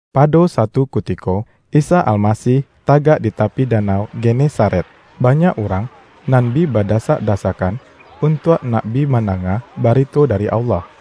Pado satu kutiko, Isa Almasih tagak di tapi danau Genesaret. Ba-nyak urang nan bi badasak-dasakkan untuak nak bi mandanga barito dari Allah.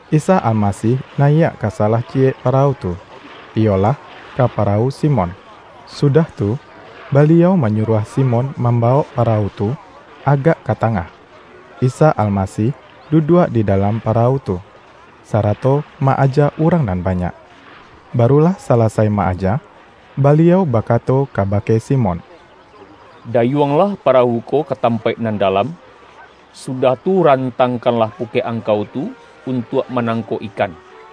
Isa Almasih nayiak ka salah ciyek pa-rawu tu, iyolah, ka parawu Simon, sudah tu, Baliau manyuruah Simon mambawok parawu tu agak ka ta-ngah. Isa Almasih duduak di dalam parawu tu, sarato ma-aja urang nan banyak. Baru lah salasai ma-aja, Baliau ba-kato kabake Simon,”Dayuanglah pa-rawu ko ka tampaik nan dalam, su-dah tu rantangkanlah pukek angkau tu, untuak manangkok ikan.”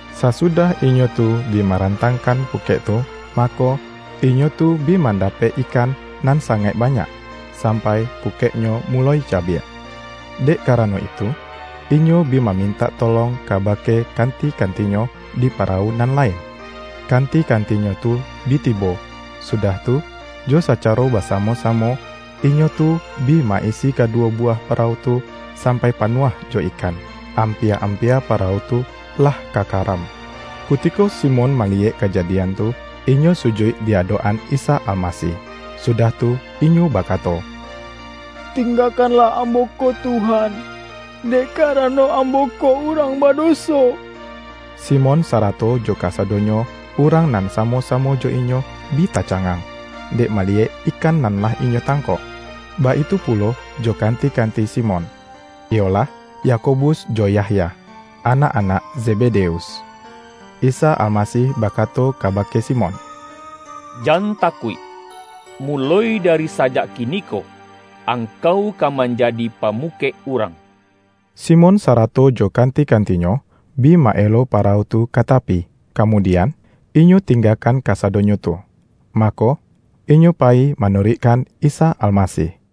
Sasudah inyo tu bi marantang-kan pukek tu, mako, inyo tu bi manda-pek ikan nan sangaik banyak, sampai pukeknyo muloi cabiak. Dek kara-no itu, inyo bi mamintak tolong kaba-ke kanti-kantinyo di parawu nan lain. Kanti-kantinyo tu bi tibo, sudah tu, jo sacaro basamo-samo, inyo tu bi ma-isi kaduwo buwah parawu tu, sampai pa-nuah jo ikan, ampia-ampia parawu tu, lah ka karam. Kutiko Simon maliyek kajadian tu, inyo sujuik di adok-an Isa Almasih, sudah tu inyo bakato,”Ting-gakanlah ambo ko Tuhan! Dek kara-no, ambo ko urang badoso!” Simon sarato jo kasadonyo urang nan samo-samo jo inyo, bi tacangang, dek maliyek ikan nan lah inyo tang-kok. Baitu pulo jo kanti-kanti Simon, iyolah, Yakobus jo Yahya, anak-anak Zebedeus. Isa Almasih bakato kaba-ke Simon,”Jan takuik! Muloi dari sa-jak kiniko, angkau ka manjadi pamu-kek urang.” Simon sarato jo kanti-kantinyo, bi ma-elo parawu tu ka tapi, kamudian, inyo tinggakan kasadonyo tu, mako, inyo payi manuruikkan Isa Almasih.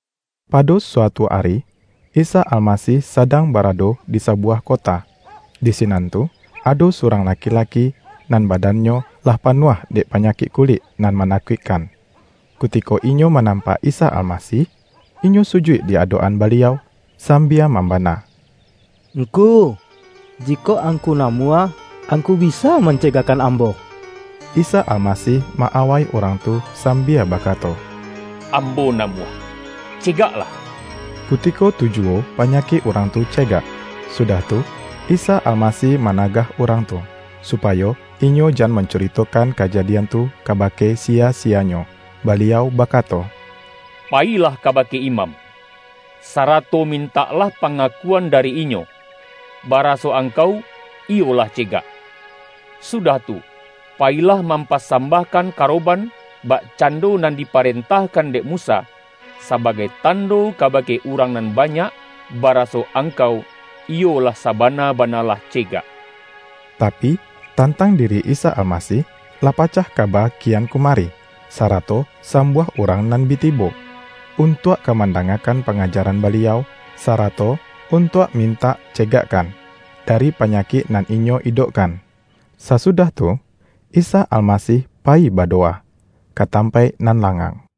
Pado suatu ari, Isa Almasih sadang barado di sabuwah kota. Di sinan tu ado surang laki-laki, nan badannyo lah panuah dek panyakik kulik nan manakuikkan. Kutiko inyo manam-pak Isa Almasih, inyo sujuik di adok-an Baliau sambia mambana,”Ngku, jikok Angku namuah, Angku bisa man-cegakkan ambo!” Isa Almasih ma-awai urang tu sam-bia bakato,”Ambo namuah, cegaklah!” Kutiko tu juwo panyakik urang tu ce-gak. Sudah tu, Isa Almasih managah urang tu, supayo inyo jan mancurito-kan kajadian tu kabake siya-siyanyo, Baliau bakato,”Payilah kabake imam, sarato mintaklah pangakuan dari inyo, baraso angkau iyo lah cegak. Sudah tu, payilah mampasambahkan karo-ban, bakcando nan diparentahkan dek Musa, sabagai tando kabake urang nan banyak, baraso angkau iyo lah saba-na-bana lah cegak.” Tapi, tantang diri Isa Almasih, lah pacah kaba kian kumari, sarato sambuah urang nan bi tibo, untuak ka mandangakan pangajaran Baliau, sarato untuak mintak dicegakkan, dari panyakik nan inyo idokkan. Sasudah tu, Isa Almasih payi bado-wa ka tampaik nan langang.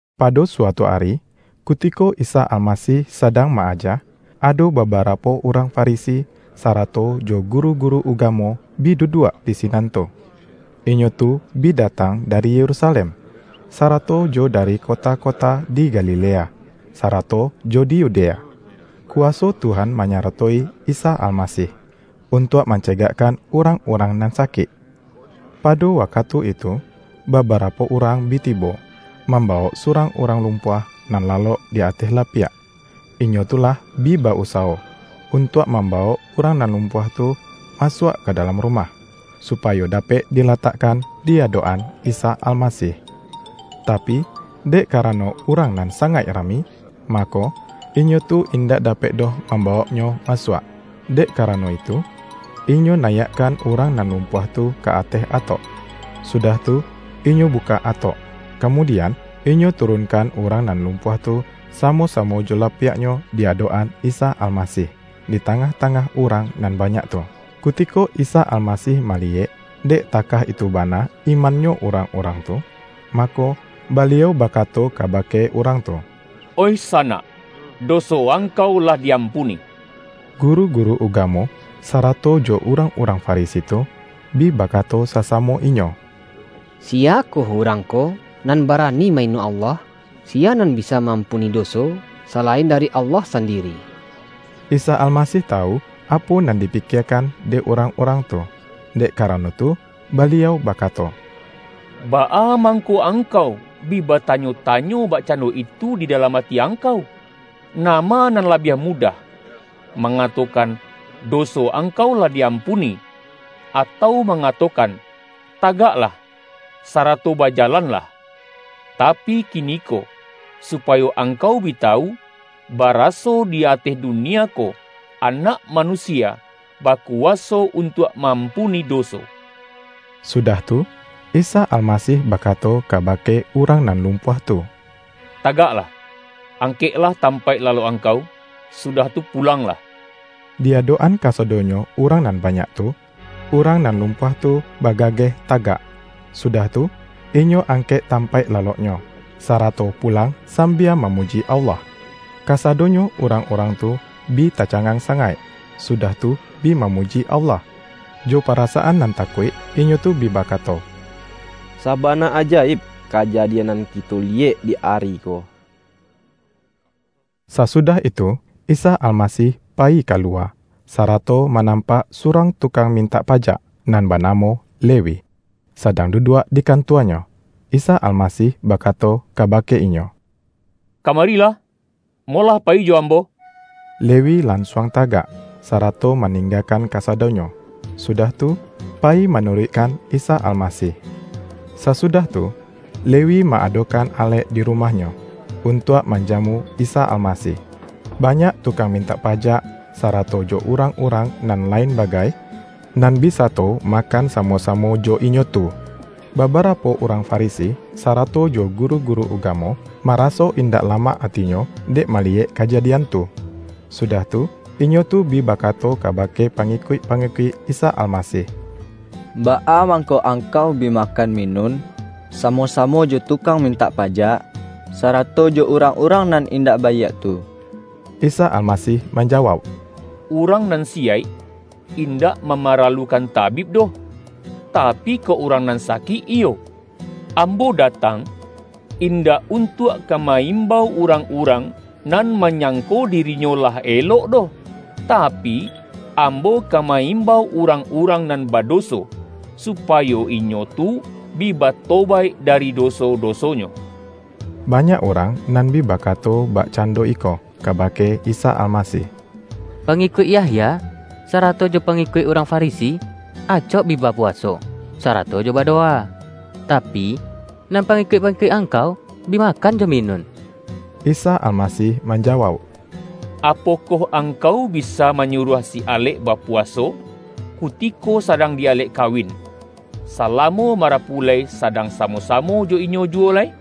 Pado suatu ari, kutiko Isa Almasih sadang ma-aja, ado babarapo urang Fa-risi, sarato jo guru-guru ugamo, bi du-duak di sinan tu. Inyo tu bi datang da-ri Yerusalem, sarato jo dari kota-kota di Galilea, sarato jo di Yudea. Kuwa-so Tuhan manyaratowi Isa Almasih, untuak mancegakkan urang-urang nan sakik. Pado wakatu itu, babarapo urang bi tibo, mambawok surang urang lumpuah nan lalok di ateh lapiak. Inyo tu lah bi ba-usawo, untuak mambawok urang nan lumpuah tu masuak ka da-lam rumah, supayo dapek dilatakkan di adok-an Isa Almasih. Tapi, dek karano urang nan sangaik rami, ma-ko, inyo tu indak dapek doh mamba-woknyo masuak. Dek karano itu, inyo nayiakkan urang nan lumpuah tu ka ateh atok. Sudah tu, inyo bukak atok, kamudian, inyo turunkan urang nan lumpuah tu, samo-samo jo lapiaknyo di adok-an Isa Almasih, di tangah-tangah urang nan banyak tu. Kutiko Isa Almasih maliyek, dek takah itu bana imannyo urang-urang tu, mako, Baliau bakato kabake urang tu,”Oih sanak, doso angkau lah di-ampuni.” Guru-guru ugamo, sarato jo urang-urang Farisi tu, bi bakato sasamo inyo,”Siyakoh Urang ko, nan barani ma-ino Allah? Siya nan bisa ma-ampuni doso, salain dari Allah sandiri?” Isa Almasih tawu, apo nan dipi-kiekan dek urang-urang tu. Dek ka-rano tu, Baliau bakato,”Baa mangko angkau bi batanyo-tanyo bakcando itu di dalam ati angkau? Nama nan la-biah mudah, mangatokan, ’Doso ang-kau lah diampuni’, atau mangatokan, ’Tagaklah, sarato bajalanlah!' Tapi kiniko supayo angkau bi tawu, baraso di ateh dunia ko, Anak Manusia baku-waso untuak ma-ampuni doso.” Sudah tu, Isa Almasih bakato kabake urang nan lumpuah tu,”Tagaklah, angkek-lah tampaik lalok angkau, sudah tu pulanglah!” Di adok-an kasadonyo urang nan banyak tu, urang nan lumpuah tu ba-gageh tagak, sudah tu, inyo angkek tampaik laloknyo, sarato pulang sam-bia mamuji Allah. Kasadonyo urang-urang tu bi ta-cangang sangaik, sudah tu bi mamu-ji Allah. Jo parasaan nan takuik, inyo tu bi bakato,”Sabana ajaib, kajadian nan kito liyek di ari ko!” Sasudah itu, Isa Almasih payi ka-luwa, sarato manampak surang tu-kang mintak pajak, nan banamo Le-wi, sadang duduak di kantuanyo. Isa Almasih bakato kabake inyo,”Kama-rilah, molah payi jo Ambo.” Lewi lansuang tagak, sarato maninggakan kasadonyo, sudah tu, payi manuruik-kan Isa Almasih. Sasudah tu, Lewi ma-adokan alek di rumahnyo, untuak manjamu Isa Almasih. Banyak tukang mintak pajak, sarato jo urang-urang nan lain bagai, nan bi sato makan samo-samo jo inyo tu. Babarapo urang Farisi, sarato jo guru-guru ugamo, maraso indak lamak atinyo dek maliyek kajadian tu, sudah tu, inyo tu bi bakato kabake pangikuik-pangikuik Isa Almasih,”Baa mangko angkau bi makan minun, samo-samo jo tukang mintak pajak, sarato jo urang-urang nan indak baiak tu?” Isa Almasih manjawauk,”Urang nan siyaik, indak mamaralukan tabib doh; tapi kok urang nan sakik iyo. Ambo datang, indak untuak ka ma-imbau urang-urang, nan manyangko dirinyo lah elok doh, tapi, Ambo ka ma-imbau urang-urang nan badoso, supayo inyo tu bi batobaik dari do-so-dosonyo.” Banyak urang nan bi bakato bak-cando iko, kabake Isa Almasih,”Pangi-kuik Yahya, sarato jo pangikuik urang Farisi, acok bi bapuwaso, sarato jo ba-dowa. Tapi, nan pangikuik-pangikuik Angkau, bi makan jo minun.” Isa Almasih manjawauk,”Apokoh angkau bisa manyuruah si alek bapu-waso, kutiko sadang di alek kawin, sa-lamo marapulai sadang samo-samo jo inyo juwo lai?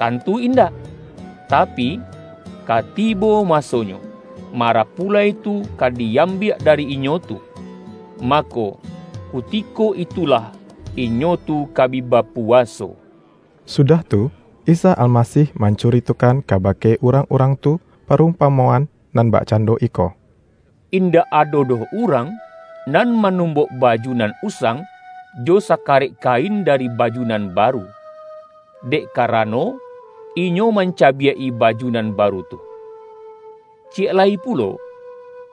Tantu indak! Tapi, ka tibo masonyo, marapulai tu ka di-am-biak dari inyo tu. Mako, kutiko itulah, inyo tu ka bi bapuwaso.” Sudah tu, Isa Almasih mancuritokan kabake urang-urang tu, parumpamoan nan bakcando iko,”Indak ado doh urang, nan manumbok baju nan usang, jo saka-rek kain dari baju nan baru. Dek karano, inyo mancabiak-i baju nan baru tu. Ciyek lai pulo,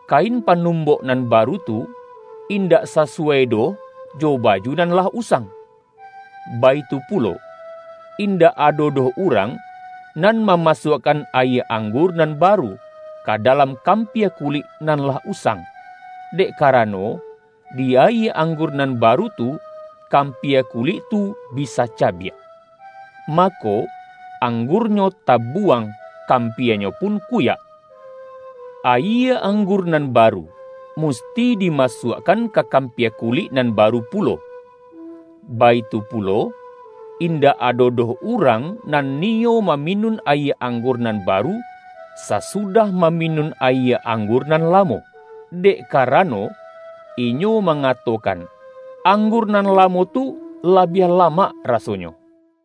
kain panumbok nan baru tu, in-dak sasuwai doh jo baju nan lah usang. Baitu pulo, indak ado doh urang, nan mamasuakkan ayie anggur nan baru, ka dalam kampia kulik nan lah usang, dek karano di ayie anggur nan baru tu, kam-pia kulik tu bisa cabiak. Mako, anggur-nyo tabuwang, kampianyo pun kuyak. Ayie anggur nan baru, musti dima-suakkan ka kampia kulik nan baru pulo Baitu pulo, indak ado doh urang nan niyo maminun ayie anggur nan baru, sa-sudah maminun ayie anggur nan lamo, dek karano, inyo mangatokan, anggur nan lamo tu labiah lamak, rasonyo.”